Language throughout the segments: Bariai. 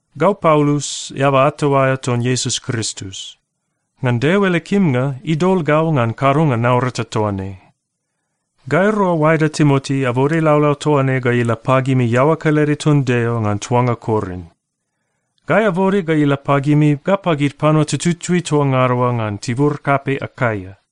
Gau Paulus, eaba ato aea ton Iesus Kristus. Ngan Deo ele kimnga, idol gau ngan kadonga naurata toa ne. Gairua oaeda Timoti abode laulau toa ne ga ila pagimi iaoa kelede ton Deo ngan tuanga Korin. Gai abode ga ila pagimi ga pagid panua tututui toa ngada oa ngan tibur kapei Akaia.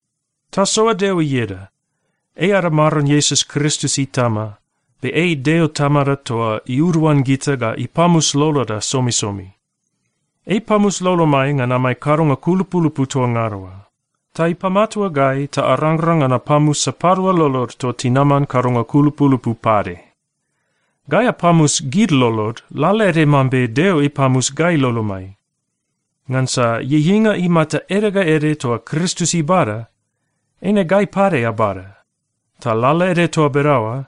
Tasoa Deo ieda! Ei ada Maron Iesus Kristus Itama, be ei Deo Tamada toa iuduan gita ga ipamus loloda somisomi. Ei ipamus lolomai ngan amai kadonga kulupulupu toa ngada oa. Ta ipamatua gai ta arangrang ngan apamus sapadua lolod toa tinaman kadonga kulupulupu pade. Gai apamus gid lolod lalaede mambe Deo ipamus gai lolomai. Ngansa ieieinga imata ede ga ede toa Kristus ibada, eine gai pade abada. Ta lalaede toa bedaoa,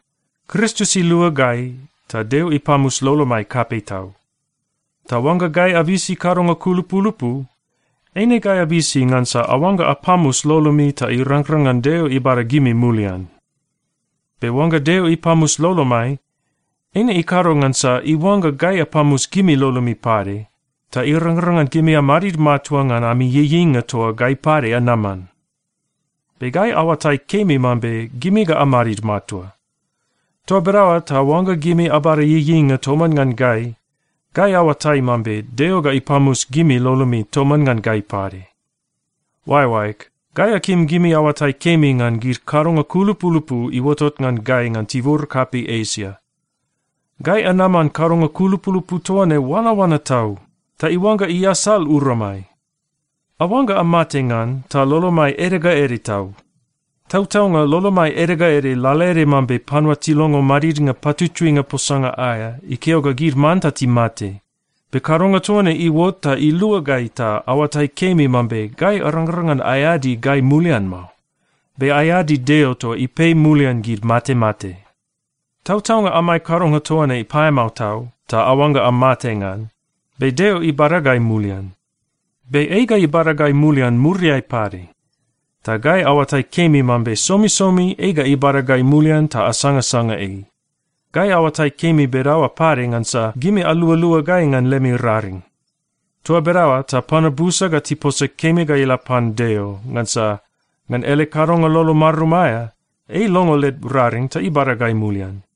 Kristus ilua gai ta Deo ipamus lolomai kapei tau. Ta oangga gai abisi kadonga kulupulupu, eine gai abisi ngansa aoangga apamus lolomi ta irangrang ngan Deo ibada gimi mulian. Be oangga Deo ipamus lolomai, eine ikado ngansa iuangga gai apamus gimi lolomi pade, ta irangrang ngan gimi amadid matua ngan ami ieieinga toa gai pade anaman. Be gai aoatai kemi mambe gimi ga amadid matua. Toa bedaoa ta oangga gimi abada ieieinga toman ngan gai, gai aoatai mambe Deo ga ipamus gimi lolomi toman ngan gai pade. Oaeoaeg, gai akim gimi aoatai kemi ngan gid kadonga kulupulupu iuotot ngan gai ngan tibur kapei Esia. Gai anaman kadonga kulupulupu toa ne oanaoana tau, ta iuangga iasal uramai. Aoangga amate ngan, ta lolomai ede ga ede tau. Tautaunga lolomai ede ga ede lalaede mambe panua tilongo madidnga patutuinga posanga aea ikeo ga gid manta timate. Be kadonga toa ne iuot ta ilua gai ta aoatai kemi mambe gai arangrang ngan aeadi gai mulian mao, be aeadi Deo toa ipei mulian gid matemate. Tautaunga amai kadonga toa ne paeamao tau, ta aoangga amate ngan, be Deo ibada gai mulian. Be ei ga ibada gai mulian muriai pade. Ta gai aoatai kemi mambe somisomi ei ga ibada gai mulian ta asangasanga ei. Gai aoatai kemi bedaoa pade ngansa gimi alualua gai ngan lemi raring. Toa bedaoa ta panua busa ga tiposa kemi ga ila pan Deo, ngansa ngan ele kadonga lolo marum aea, ei ilongo led raring ta ibada gai mulian.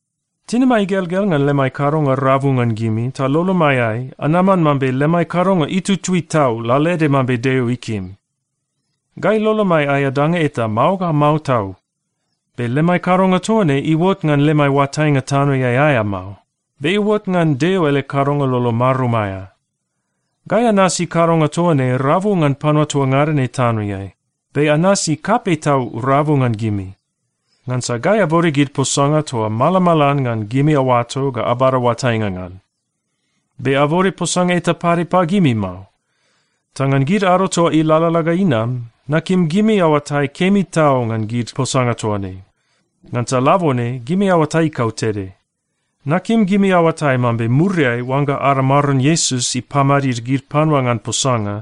Tinimai igelgel ngan lemai kadonga rabu ngan gimi, ta lolomaiai anaman mambe lemai kadonga itutui tau lalaede mambe Deo ikim. Gai lolomai aea danga eta mao ga mao tau. Be lemai kadonga toa ne iuot ngan lemai oatainga tanoeai aea mao, be iuot ngan Deo ele kadonga lolo marum aea. Gai anasi kadonga toa ne rabu ngan panua toa ngada ne tanoeai, be anasi kapei tau rabu ngan gimi. Ngansa gai abode gid posanga toa malamalan ngan gimi aoato ga abada oatainga ngan. Be abode posanga eta pade pagimi mao. Ta ngan gid ado ta ilalala ga inam, nakim gimi aoatai kemi tau ngan gid posanga toa ne. Ngansa labone gimi aoatai kautede. Nakim gimi aoatai mambe muriai oangga ada Maron Iesus ipamadid gid panua ngan posanga,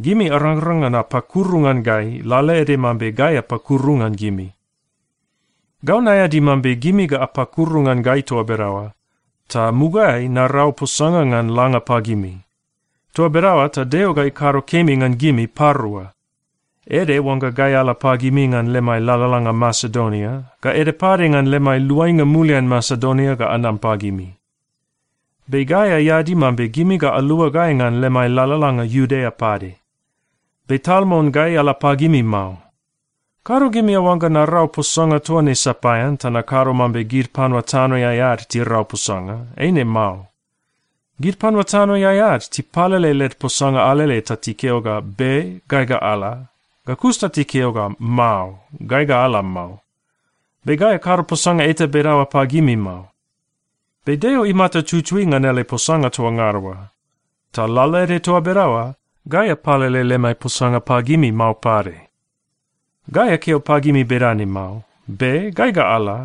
gimi arangrang ngan apakuru ngan gai lalaede mambe gai apakuru ngan gimi. Gau naeadi mambe gimi ga apakuru ngan gai toa bedaoa, ta mugaeai narau posanga ngan langa pagimi. Toa bedaoa ta Deo ga ikado kemi ngan gimi parua. Ede oangga gai ala pagimi ngan lemai lalalanga Masedonia, ga ede pade ngan lemai luainga mulian Masedonia ga anam pagimi. Be gai aeadi mambe gimi ga alua gai ngan lemai lalalanga Iudea pade. Be tal mon gai ala pagimi mao. Kado gimi aoangga narau posanga toa ne sapaean ta nakado mambe gid panua tanoeai ad tirau posanga. Eine mao. Gid panua tanoeai ad tipalele led posanga alele ta tikeo ga, “Be. Gai ga ala,” ga kus ta tikeo ga, “Mao. Gai ga ala mao.” Be gai akado posanga eta bedaoa pagimi mao. Be Deo imata tutui ngan ele posanga toa ngada oa. Ta lalaede toa bedaoa, gai apalele lemai posanga pagimi mao pade. Gai akeo pagimi bedane mao, “Be. Gai ga ala,”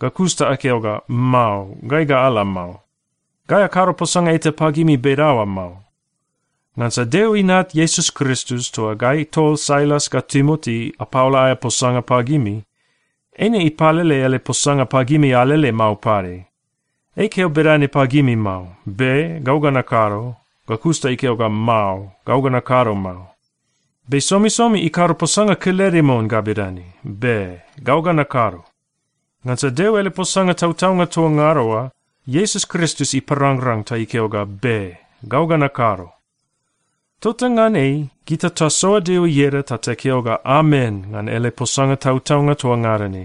ga kus ta akeo ga, “Mao. Gai ga ala mao.” Gai akado posanga eta pagimi bedaoa mao. Ngansa Deo Inat Iesus Kristus toa gai tol Sailas ga Timoti apaola aea posanga pagimi, eine ipalele ele posanga pagimi alele mao pade. Ei ikeo bedane pagimi mao, “Be. Gau ga nakado,” ga kus ta ikeo ga, “Mao. Gau ga nakado mao.” Be somisomi ikado posanga kelede mon ga bedane, “Be. Gau ga nakado.” Ngansa Deo ele posanga tautaunga toa ngada oa, Iesus Kristus iparangrang ta ikeo ga, “Be. Gau ga nakado.” Tota ngan ei, gita tasoa Deo ieda ta takeo ga, “Amen,” ngan ele posanga tautaunga toa ngada ne.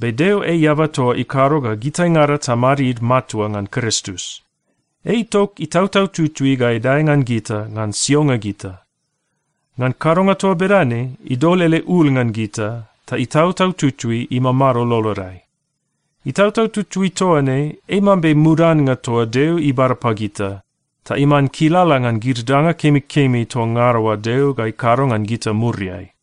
Be Deo ei eaba toa ikado ga gitaingada tamadid matua ngan Kristus. Ei itok Itautau Tutui ga idae ngan gita ngan sionga gita. Ngan kadonga toa bedane, idol ele ul ngan gita, ta Itautau Tutui imamado lolodai. Itautau Tutui toa ne ei mambe mudannga toa Deo ibada pagita, ta iman kilala ngan gid danga kemikemi toa ngada oa Deo ga ikado ngan gita muriai.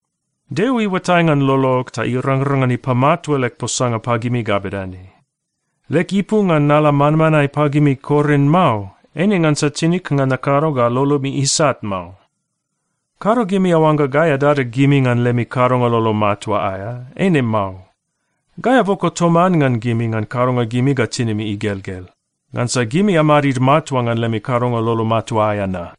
Deo iuatai ngan lolog ta irangrang ngan ipamatua leg posanga pagimi ga bedane: Leg ipu ngan nala manmanae pagimi Korin mao, eine ngansa tinig ngan nakado ga lolomi isat mao. Kado gimi aoangga gai adada gimi ngan lemi kadonga lolo matua aea. Eine mao. Gai aboko toman ngan gimi ngan kadonga gimi ga tinimi igelgel, ngansa gimi amadid matua ngan lemi kadonga lolo matua aea na.